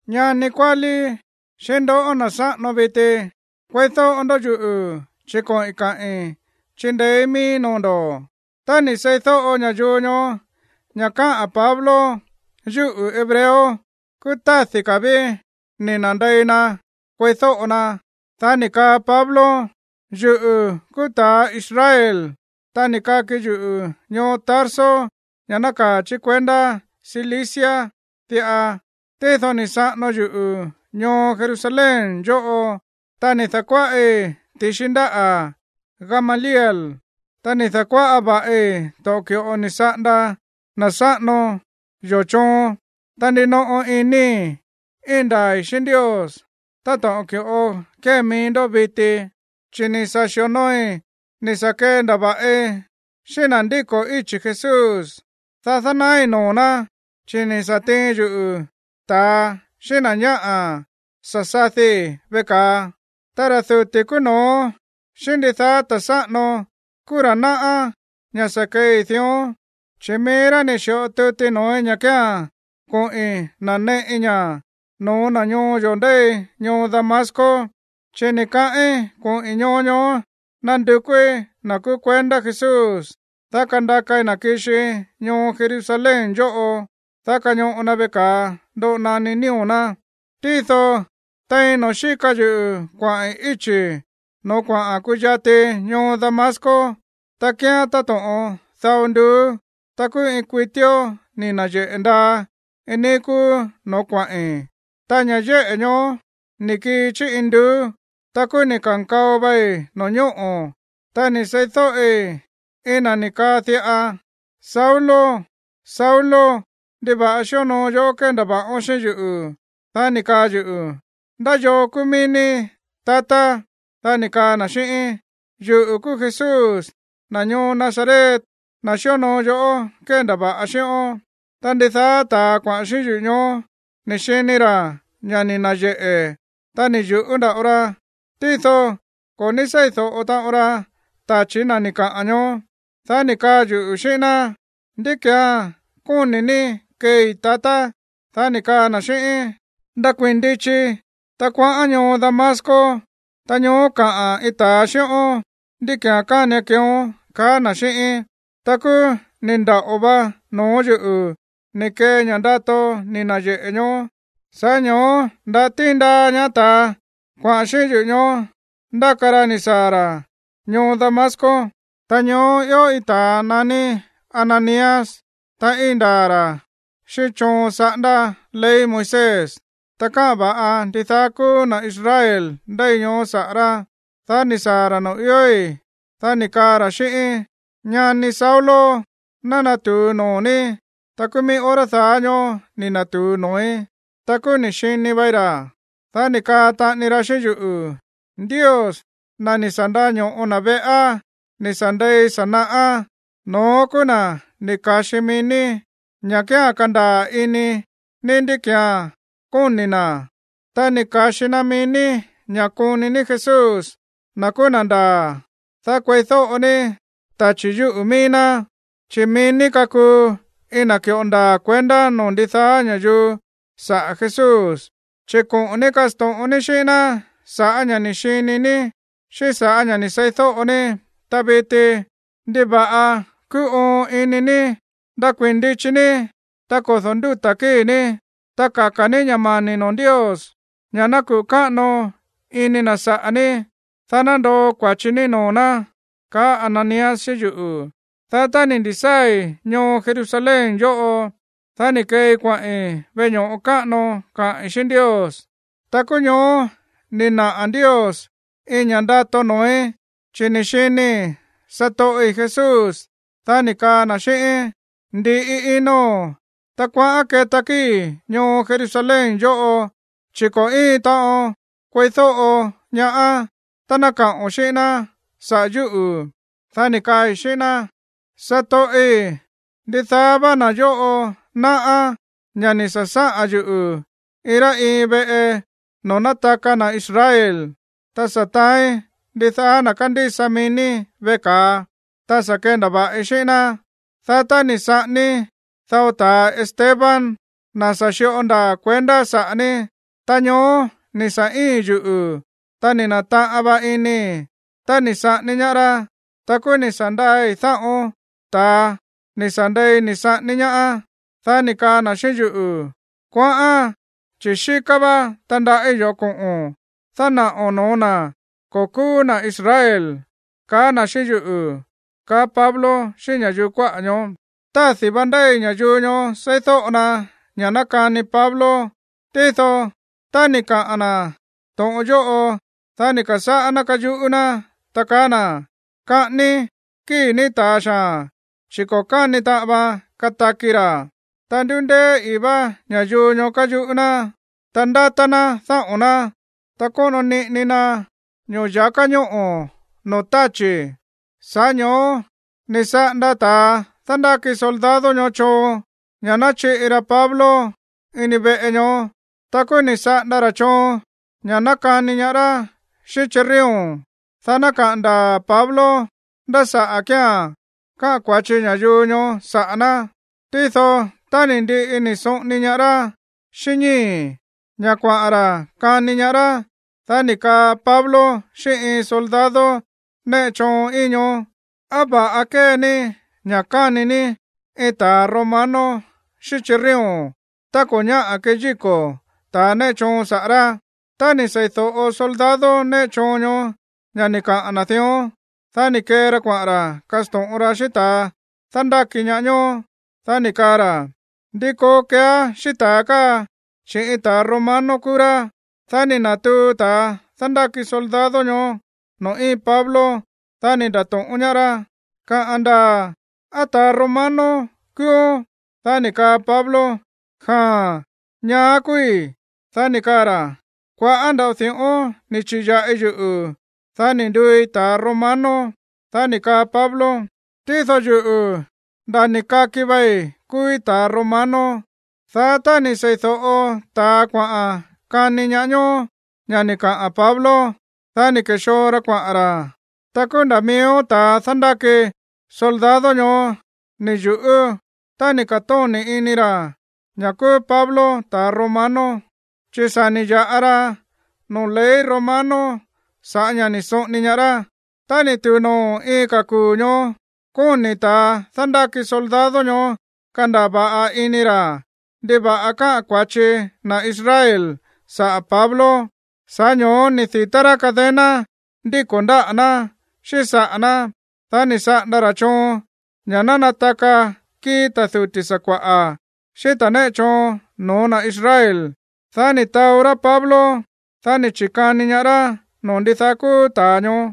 ―Ñani kuálí, xíꞌín ndoꞌó, na̱ sáꞌano viti, kueídóꞌo ndó yuꞌu̱, chi̱ koꞌi̱n kaꞌi̱n chindeéí miíí noo̱ ndo̱. Tá ni̱ seídóꞌo ña̱yuu ñoó ña̱ káꞌa̱n Pablo yúꞌu̱ hebreo, kúú tádi̱ ka̱ ví ni̱ na̱ndei na kueídóꞌo na. Dá ni̱ kaa Pablo: ―Yuꞌu̱ kúú ta̱ Israel, ta ni̱ kaki yuꞌu̱ ñoo Tarso, ña̱ nákaa̱ chí kuendá Cilicia diꞌa. Tído ni̱ saꞌano yuꞌu̱ ñoo Jerusalén yóꞌo. Ta ni̱ da̱kuáꞌi ti̱xi ndáꞌa̱ Gamaliel. Ta ni̱ da̱kuáꞌa va̱ꞌi to̱ꞌon ki̱ꞌo ni̱ saꞌanda na̱ sáꞌano yó choon. Ta ndinoꞌo inii̱ íin ndaa̱i̱ xíꞌín Ndios, táto̱ꞌon ki̱ꞌo kée mií ndó viti. Chi̱ ni̱ sa̱ xi̱onooi ni̱ sa̱ kendava̱ꞌi xíꞌín na̱ ndíko̱ íchi̱ Jesús, dá dánaái̱ noo̱ ná, chi̱ ni̱ sa̱ tiin yuꞌu̱ ta̱a xíꞌín na̱ ñáꞌa̱ sa̱ sadii̱ veꞌe ka̱a. Ta ra̱ duti̱ kúú no̱ó xíꞌín ndidaá ta̱ sáꞌano kúú ra̱ náꞌá ña̱ sa̱ keei dión. Chi̱ mií rá ni̱ xi̱ꞌo tuti noo̱í ña̱ kía̱n koꞌi̱n naneꞌi ña̱ no̱ó na̱ ñoo yo̱ ndéi ñoo Damasco. Chi̱ ni̱ kaꞌín koꞌi̱n ñoo ñoó nandukúí na̱ kúú kuendá Jesús, dá kandakai na̱ kixii ñoo Jerusalén yóꞌo, dá kañoꞌo na veꞌe ka̱a ndoꞌo naní nío̱ ná. ’Tído tein noo̱ xíka yuꞌu̱ kuaꞌi̱n íchi̱ noo̱ kuaꞌa̱n kuyati ñoo Damasco, ta kíán táto̱ꞌon dao nduú, ta kúú iin kuitíó ni̱ na̱yeꞌe̱ ndaa iin níí kúú no̱ó kuaꞌi̱n, ta ña̱ yéꞌe̱ ñoó ni̱ kii chí induú. Ta kúú ni̱ ka̱nkao vai no̱ñóꞌo̱. Ta ni̱ seídóꞌi iin na̱ ni̱ kaa diꞌa: “Saulo, Saulo, ¿ndiva̱ꞌa xíonoo yoꞌó kéndava̱ꞌón xíꞌín yuꞌu̱?” Dá ni̱ kaa yuꞌu̱: “¿Ndá yoo kúú mií ní, tatá?” Dá ni̱ kaa na̱ xíꞌíín: “Yuꞌu̱ kúú Jesús, na̱ ñoo Nazaret, na̱ xíonoo yoꞌó kéndava̱ꞌa xíꞌón.” Ta ndidaá ta̱a kuaꞌa̱n xíꞌín yuꞌu̱ ñoó ni̱ xini ra̱ ña̱ ni̱ na̱yeꞌe̱, ta ni̱ yu̱ꞌú nda̱ꞌo ra. Tído ko̱ ní seídóꞌo taꞌon ra tachi̱ na̱ ni̱ kaꞌa̱n ñoó. Dá ni̱ kaa yuꞌu̱ xíꞌín ná: “¿Ndí ki̱án kóni̱ ní keei, tatá?” Dá ni̱ kaa na̱ xíꞌíín: “Ndakuii̱n ndichi, ta kuaꞌán ñoo Damasco. Ta ñoó kaꞌa̱n iin ta̱a xíꞌón ndí ki̱án kánian keeón”, kaá na̱ xíꞌíín. Ta kúú ni̱ ndaꞌo va noo̱ yúꞌu̱ ni̱ kee ña̱ ndato ni̱ na̱yeꞌe̱ ñoó. Sa̱ꞌá ño̱ó nda̱ tíin ndaa ñaá ta̱a kuaꞌa̱n xíꞌín yuꞌu̱ ñoó ndáka ra yuꞌu̱ ni̱ saa̱ ra̱ ñoo Damasco. ’Ta ñoó ió iin ta̱a naní Ananías, ta íin ndaa̱ ra̱ xíꞌín choon saꞌándá ley Moisés. Ta káꞌa̱n va̱ꞌa ndidaá kúú na̱ Israel ndéi ñoó saꞌa̱ rá. Dá ni̱ ka̱sáa̱ ra̱ noo̱ iói̱. Dá ni̱ kaa ra̱ xíꞌíín: “Ñani Saulo, ná natu̱u noo̱ ní.” Ta kúú mií hora daá ñóó ni̱ na̱tu̱u noo̱í. Ta kúú ni̱ xini vai ra̱. Dá ni̱ kaa taꞌani ra xíꞌín yuꞌu̱: “Ndios, na̱ ni̱ sa̱ ndaño̱ꞌo na̱ veꞌá ni̱ sa̱ ndei sa̱ naꞌá, no̱ón kúú na̱ ni̱ ka̱xi mií ní ña̱ kía̱n kandaa̱ ini ní ndí ki̱án kóni̱ na̱. Ta ni̱ ka̱xi na mií ní ña̱ koni ní Jesús, na̱ kúú na̱ ndaa̱, dá kueídóꞌo ní tachi̱ yúꞌu̱ mií ná. Chi̱ mií ní kakuu iin na̱ ki̱ꞌo ndaa̱ kuendá noo̱ ndidaá ña̱yuu saꞌa̱ Jesús, chi̱ koꞌo̱n ní kasto̱ꞌon ní xíꞌín ná sa̱ꞌá ña̱ ni̱ xini ní xíꞌín sa̱ꞌá ña̱ ni̱ seídóꞌo ní. Ta viti, ¿ndiva̱ꞌa kuu oon ini ní? Ndakuii̱n ndichi ní, ta kodo̱ ndúta̱ kíi̱ ní, ta kaka̱ ní ña̱ mani̱ noo̱ Ndios ña̱ ná kuꞌu̱ káꞌano ini na̱ saꞌa̱ ní, dá ná ndoo kua̱chi ní noo̱ ná”, kaá Ananías xíꞌín yuꞌu̱. ’Dá tá ni̱ ndi̱sáa̱i̱ ñoo Jerusalén yóꞌo, dá ni̱ keei kuaꞌi̱n veꞌe ño̱ꞌo káꞌano kaꞌi̱n xíꞌín Ndios. Ta kúú ñoó ni̱ naꞌa̱ Ndios iin ña̱ꞌa ndato noo̱í. Chi̱ ni̱ xinii̱ satoꞌi̱ Jesús. Dá ni̱ kaa na̱ xíꞌíín: “Ndi̱ꞌi ino̱n, ta kuaꞌán keta kíi̱ ñoo Jerusalén yóꞌo, chi̱ ko̱ íin taꞌon kueídóꞌo ñaá tá ná kaꞌo̱n xíꞌín ná saꞌa̱ yúꞌu̱.” Dá ni̱ kaai̱ xíꞌín ná: “Satoꞌi̱, ndidaá vá na̱ yóꞌo náꞌá ña̱ ni̱ sa̱ sáꞌa̱n yuꞌu̱ iin rá iin veꞌe noo̱ nátaka na̱ Israel. Ta sa̱ taáín ndidaá na̱ kándísa mií ní veꞌe ka̱a. Ta sa̱ kendava̱ꞌi xíꞌín ná. Dá tá ni̱ saꞌání dao ta̱a Esteban, na̱ sa̱ xi̱ꞌo ndaa̱ kuendá saꞌa̱ ní, ta ñoó ni̱ sa̱ íi̱n yuꞌu̱, ta ni̱ na̱taꞌan va inii̱ tá ni̱ saꞌání ñaá rá. Ta kúú ni̱ sa̱ ndaai̱ dáꞌo̱n ta̱a ni̱ sa̱ ndei ni̱ saꞌání ñaá.” Dá ni̱ kaa na̱ xíꞌín yuꞌu̱: “Kuaꞌán, chi̱ xíká vá tandaꞌí yo̱ꞌó koꞌo̱n dánaꞌo̱n no̱ó na̱ ko̱ kúú na̱ Israel”, kaá na̱ xíꞌín yuꞌu̱ ―kaá Pablo xíꞌín ña̱yuu kuáꞌa̱ ñoó. Tádi̱ vá ndéi ña̱yuu ñoó seídóꞌo na ña̱ nákani Pablo. Tído tá ni̱ kaꞌa̱n na̱ to̱ꞌon yóꞌo, dá ni̱ ka̱sáꞌá ná káyuꞌú ná, ta kaá na̱: ―¡Kaꞌání kíi̱ ní ta̱a xaa̱n, chi̱ ko̱ káni taꞌan vaan kataki ra̱! Ta ndúndéé ii̱ vá ña̱yuu ñoó káyuꞌú ná, ta ndátá ná dáꞌo̱n ná, ta sóꞌono niꞌini na ño̱ya̱ká ñóꞌo̱ noo̱ táchi̱. Sa̱ꞌá ño̱ó ni̱ saꞌanda ta̱a dándáki soldado ñoó choon ña̱ ná chiꞌi ra Pablo ini veꞌe ñoó. Ta kúú ni̱ saꞌanda ra̱ choon ña̱ ná kani ñaá rá xíꞌín chirrión, dá ná kaꞌa̱n ndaa̱ Pablo ndá saꞌa̱ kía̱n káꞌa̱n kua̱chi ña̱yuu ñoó saꞌa̱ ná. Tído, tá ni̱ ndiꞌi ni̱ soꞌoni ñaá rá xíꞌín ñíi̱, ña̱ kuaꞌa̱n ra̱ kani ñaá rá, dá ni̱ kaa Pablo xíꞌín iin soldado néꞌe choon íin ñoó: ―¿Á va̱ꞌa kée ní ña̱ kani ní iin ta̱ romano xíꞌín chirrión tá ko̱ ñáꞌa̱ keyíko̱ ta̱ néꞌe choon saꞌa̱ rá? Tá ni̱ seídóꞌo soldado néꞌe choon ñoó ña̱ ni̱ kaꞌa̱n na̱ dión, dá ni̱ kee ra kuaꞌa̱n ra̱ kasto̱ꞌon ra xíꞌín ta̱a dándáki ñaá ñoó. Dá ni̱ kaa ra̱: ―¿Ndi koo keeá xíꞌín ta̱a káa, chi̱ iin ta̱ romano kúú rá? Dá ni̱ na̱tuu ta̱a dándáki soldado ñoó noo̱ íin Pablo. Dá ni̱ nda̱to̱ꞌón ñaá rá: ―Kaꞌa̱n ndaa̱, ¿á ta̱ romano kúúón? Dá ni̱ kaa Pablo: ―Jaa̱n. Ñaá kúúí. Dá ni̱ kaa ra̱: ―Kua̱ꞌá nda̱ꞌo di̱ꞌón ni̱ chi̱ya̱ꞌi yuꞌu̱, dá ni̱ nduui ta̱ romano. Dá ni̱ kaa Pablo: ―Tído yuꞌu̱, nda̱ ni̱ kaki vei kúúí ta̱ romano. Dá tá ni̱ seídóꞌo ta̱a kuaꞌa̱n kani ñaá ñoó ña̱ ni̱ kaꞌa̱n Pablo, dá ni̱ ke̱xoo ra kuaꞌa̱n ra̱. Ta kúú nda̱ miíó ta̱a dándáki soldado ñoó ni̱ yu̱ꞌú tá ni̱ ka̱tóni̱ ini ra̱ ña̱ kúú Pablo ta̱ romano, chi̱ sa̱ ni̱ ya̱ꞌa ra noo̱ ley romano sa̱ꞌá ña̱ ni̱ soꞌoni ñaá rá. Tá ni̱ tu̱u noo̱ iin ka̱ kuu̱ ñoó, kóni̱ ta̱a dándáki soldado ñoó kandaa̱ va̱ꞌa ini ra̱ ndiva̱ꞌa káꞌa̱n kua̱chi na̱ Israel saꞌa̱ Pablo. Sa̱ꞌá ño̱ó ni̱ di̱tá rá cadena ndíko̱ ndáꞌa̱ ná xíꞌín saꞌa̱ ná. Dá ni̱ saꞌanda ra̱ choon ña̱ ná nataka kíi̱ ta̱ duti̱ sakua̱ꞌa̱ xíꞌín ta̱ néꞌe choon no̱ó na̱ Israel. Dá ni̱ taó rá Pablo. Dá ni̱ chi̱kani ñaá rá noo̱ ndidaá kúú ta̱a ñoó.